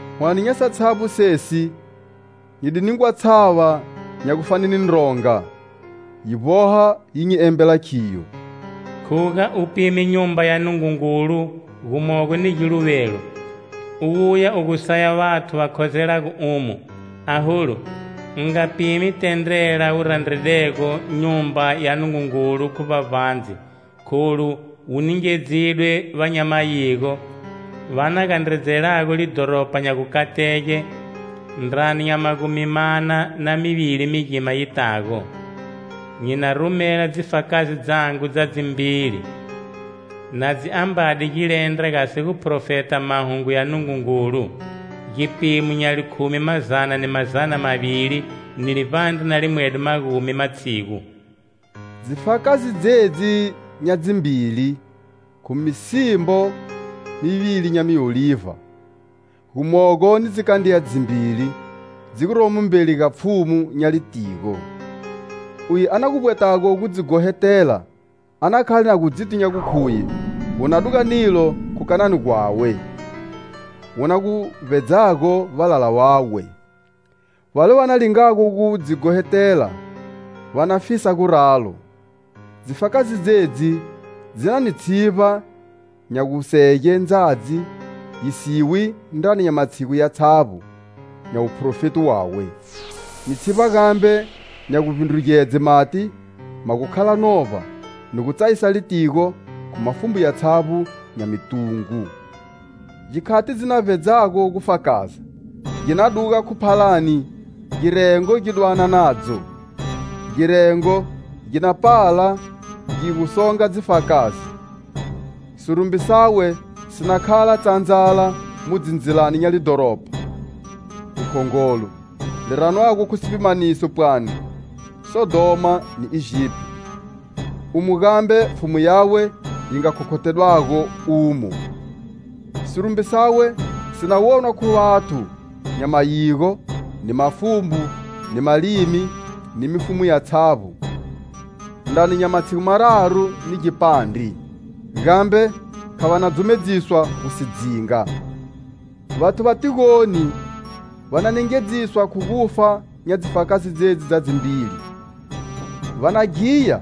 Hwane nya satshavbo sesi nyi di ningwa tshava nya gu fane ni ndronga, yi vboha yi nyi embela khiyo: "Khuga u pime Nyumba ya Nungungulu gumogo ni giluvelo, u wuya u gu saya vathu va khozelago umo. Aholu, u nga pimi tendrela wu randredego Nyumba ya Nungungulu khu vbavbandze kholu wu ningedzidwe va nya mayigo va na gandredzelago lidhoropa nya gukatege ndrani nya magumi mana na mivili migima yitago. Nyi na rumela dzifakazi dzangu dza dzimbili na dzi ambade gilendra gasi guphrofeta mahungu ya Nungungulu, gipimo nya likhumi mazana ni mazana mavili ni livbandre na limwedo magumi matshigu." Dzifakazi dzedzi nya dzimbili khu misimbo mivili nya miolivha, gumogo ni dzikandriya dzimbili dzi guromo mbeli ga Pfhumu nya litigo. Uye a na gu vbwetago gu dzi ghohetela, a na khale na gu dziti gu khuye gu na duga nilo khu kanani gwawe, wu na gu vbedzago valala vawe. Vale va na lingago gu dzi ghohetela va na fisa guralo. Dzifakazi dzedzi dzi na ni tshivba nya gusege ndzadzi yi siwi ndrani nya matshigu yatshavbo nya wuphrofeti wawe, ni tshivba gambe nya guvbindrugedze mati ma gu khala novba, ni gu tsayisa litigo khu mafumbu yatshavbo nya mitungu. Gikhati dzi na vbedzago gu fakaza; gi na duga khu phalani girengo gi dwana nadzo. Girengo gi na pala gi gu songa dzifakazi. Sirumbi sawe si na khala tshandzala mu dzindzilani nya lidhoropa likhongolo, li ranwago khu gipimaniso pwani Sodhoma ni Egipito, umo gambe Pfhumu yawe yi nga khokhothedwago umo. Sirumbi sawe si na wonwa khu vathu nya mayigo, ni mafumbo, ni malimi ni mifumu yatshavbo, ndrani nya matshigu mararu ni gipandre, gambe kha va na dzumedziswa gu si dzinga. Vathu va tigoni va na nengedziswa khu gufa nya dzifakazi dzedzi dza dzimbili. Va na ghiya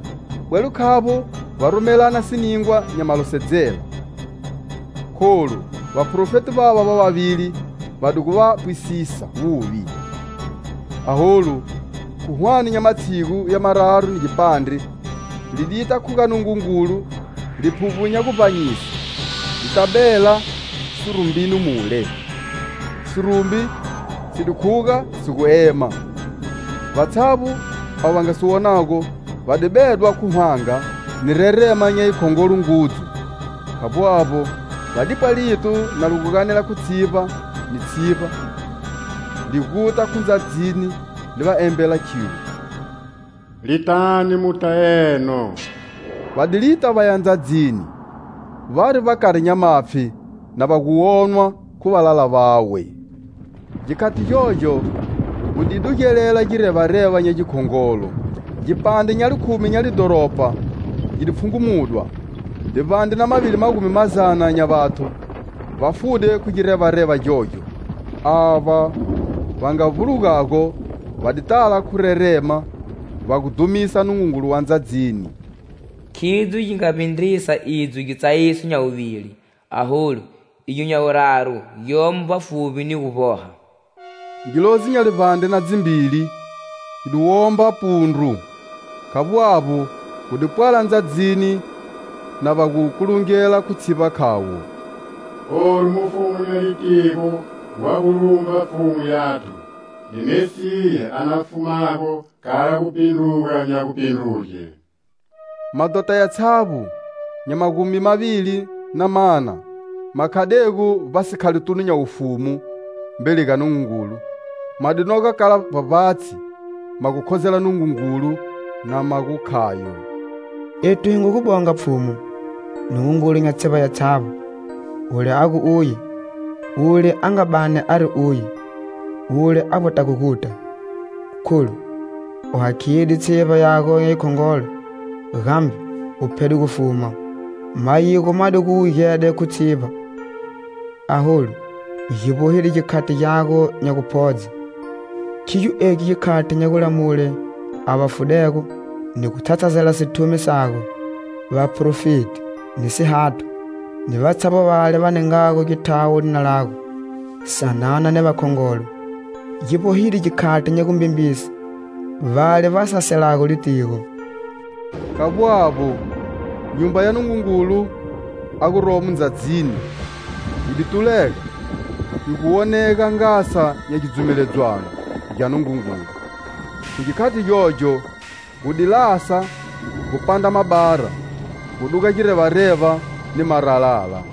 bwelo khavbo va rumelana siningwa nya malosedzela, kholu vaprofeti vava va vavili va di gu va pwisisa wuvi. Aholu, khu hwane nya matshigu ya mararu ni gipandre, lidita khu ga Nungungulu Liphuvbo nya guvbanyise lita bela sirumbini mule. Sirumbi si di khuga si gu ema, vatshavbo avo va nga si wonago, va di bedwa khu hwanga ni rerema nya yi khongolo ngudzu. Khavbo avbo, va dipwa lito na li gu ganela khu tshivba ni tshivba li guta khu ndzadzini, li va embela khilo: "Litani muta eno!" Va di lita vaya ndzadzini, vari vbakari nya mapfhi, na va gu wonwa khu valala vawe. Gikhati gyogyo, gu di dugelela girevareva nya gikhongolo. Gipandre nya likhumi nya lidhoropa gi di pfhungumudwa. Livbandre na mavili magumi mazana nya vathu va fude khu girevareva gyogyo. Ava va nga vbulugago va di tala khu rerema va gu dhumisa Nungungulu wa ndzadzini. Khidzo gi nga vbindrisa idzo gitsayiso nya wuvili. Aholu igyo nya wuraru gyomo vbafuvbi ni gu vboha. Ngilozi nya livbandre na dzivili yi di womba pundru. Khavbo avbo, gu di pwala ndzadzini na va gu kulungela khu tshivba khavo: "Olu, Mufumu nya litigo wa gu lumba Pfhumu yathu, ni Mesiya a na fumago kala gupindruga nya gupindruge." Madhota yatshavbo nya magumi mavili na mana ma khadego vbasikhalotunu nya wufumu mbeli ga Nungungulu, ma di noga kala vbavbatshi, ma gu khozela Nungungulu na ma gu khayo: "Ethu hi ngu gu bonga Pfhumu,Nungungulu nya tshivba yatshavbo,wule a gu uye, wule a nga bani ari uye, wule a vbwetago guta.Kholu u hakhide tshivba yago nya yikhongolo, gambe u phede gufuma! Mayigo ma di gu wugede khu tshivba,aholu gi vbohide gikhati gyago nya guphodze.Khigyo egi gikhati nya gulamule avo vafudego ni gu tshatshazela sithumi sago, vaphrofeti; ni sihathwa, ni vatshavbo vale va ningago githawo lina lago, sanana ni vakhongolo.Gi vbohide gikhati nya gumbembise vale va saselago litigo." Khavbo avbo, Nyumba ya Nungungulu a guromo ndzadzini yi di tulega, yi gu wonega Ngasa nya gidzumeledzwano gya Nungungulu, khu gikhati gyogyo, gu di lasa, gu pandra mabara, gu duga girevareva, ni maralala.